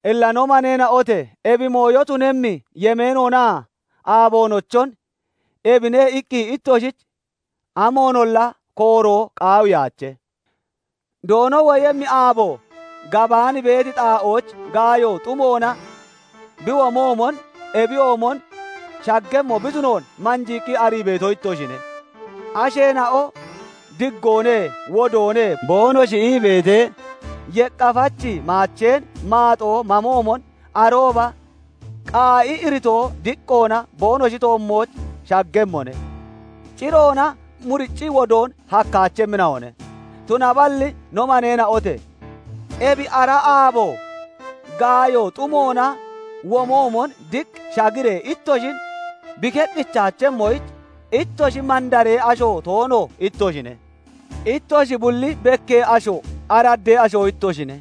Illa no maneena'ote! Ebi mooyo tunemmi yemeenoonaa aaboonochon ebine iqqi ittoshich amoonolla kooroo qaawiyaache; Doono woyemmi aabo, gabaan beeti xaa'ooch gaayo xumoona bi womoomon, ebiyoomon shaggemmo bi tunoon manjiiqqi arii beeto ittoshine. Asheena'o "Diggoone; wodoone" boonoshi ii beetee, yeqqafachi maacheen maaxoo mamoomon arooba qaa'i iritoo diqqoona boonoshi toommooch shaggemmone; ciroona muriccii wodoon hakkaachemmina'one. Tunaballi no maneena'ote! Ebi ara aabo gaayo xumoona womoomon diq shagiree ittoshin bi keqqichaachemmoyich, ittoshi mandaree asho toono ittoshine; ittoshi bulli bekkee asho, araddee ashoo ittoshine;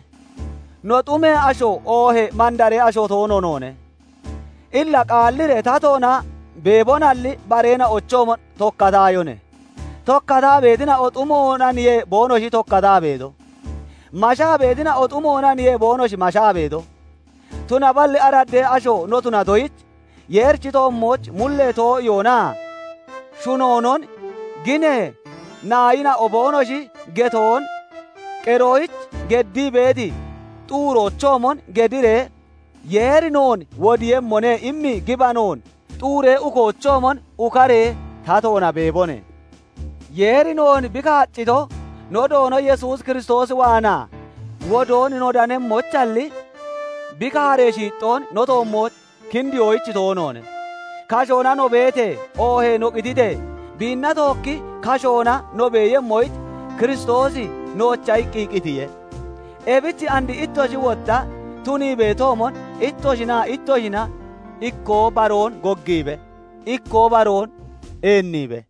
no, xumee asho oohee mandaree asho toono noone. Illa qaalliree tatoona beebonalli, bareena'ochoomon tokkataayone. Tokkataa beetina'o xumoonaniye boonoshi tokkataa beeto; mashaa beetina'oo xumoonaniye boonoshi mashaa beeto; tunaballi araddee asho no tunatoyich, Yeerichi toommooch mullee too'iyoonaa shunoonon ginee naayina'o boonoshi getoon qeroyich geddii beeti xuuroochoomon gediree, "Yeeri noon wodiiyemmone" imi gibanoon xuuree ukoochoomon ukaree tatoona beebone; Yeeri noon bi kaaccito, no Doono Yesuus Kiristoos waanaa wodoon no danemmoyichalli, bi kaaree shiixxoon no toommooch kindiyoyich toonoone. Kashoona no beetee, oohee no qititee, biinna tookki kashoona no beeyemmoyich Kiristoosi noocha iqqi qitiye. Ebich and ittoshi wotta tunii beetoomon, ittoshinaa ittoshina ikkoo baroon goggiibe; ikkoo baroon eenniibe.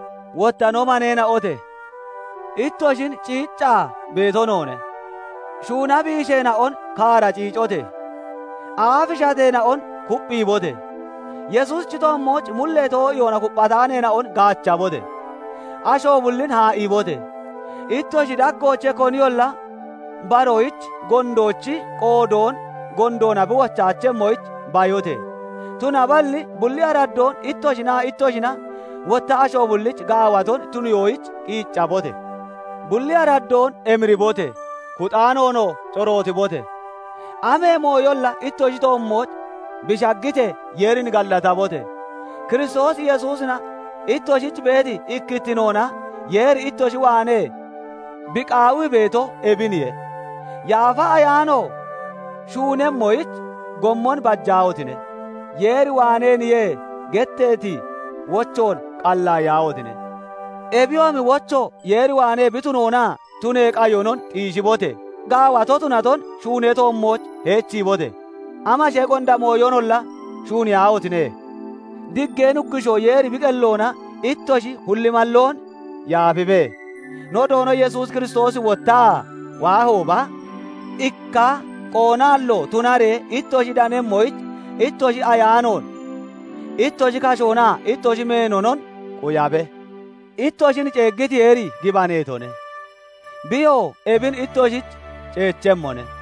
Wotta no maneena'ote! Ittoshin ciiccaa beeto noone; shuuna biisheena'on kaara ciicote! Aafi shateena'on kupphiibote! Yesuusichi toommooch mullee too'iyoona kupphataaneena'on gaachabote! Asho bullin haa'iibote! Ittoshi daggoochee koniyolla baroyich gondoochi qoodoon gondoona bi wochaachemmoyich bayote! Tunaballi bulli araddoon ittoshinaa ittoshina, wotta asho bullich gaawaton tuniyoyich qiiccabote! Bulli araddoon emiribote! Kuxaanoonoo corootibote! Amee mooyolla ittoshi toommooch bi shaggitee, Yeerin gallatabote! Kiristoos Yesuusina ittoshich beeti ikkittinoona Yeeri ittoshi waanee bi qaawii beeto ebiniye. Yaafa Ayaano shuunemmoyich gommon bajaahotine! "Yeer waaneeniye" getteeti wochoon qallaayiyaahotine! Ebiyoomi wocho Yeer waanee bi tunoonaa tunee qayonon xiishibote! Gaawato tunaton shuunee toommooch heechiibote! Amashee gonda mooyonolla shuuniyaahotine! Diggee Nuggushoo Yeeri bi qelloona ittoshi hulli malloon yaafibe; no Doono Yesuus Kiristoosi wottaa waahooba ikka qoonaallo tunaree ittoshi danemmoyich, ittoshi ayaanoon, ittoshi kashoonaa ittoshi meenonon quyabe. Ittoshin ceeggiti Yeeri gibaneetone; biyoo ebin ittoshich ceechemmone.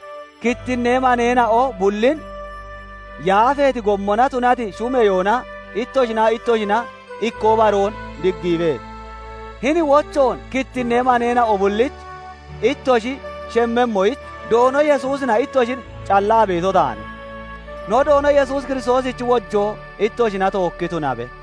Kittinnee maneena'o bullin yaafeeti gommona tunati shumeyoona ittoshinaa ittoshina ikkoo baroon diggiibe. Hini wochoon kittinnee maneena'o bullich ittoshi shemmemmoyich, Doono Yesuusina ittoshin callaa beeto taane. No Doono Yesuus Kiristoosichi wojoo ittoshina tookki tunabe.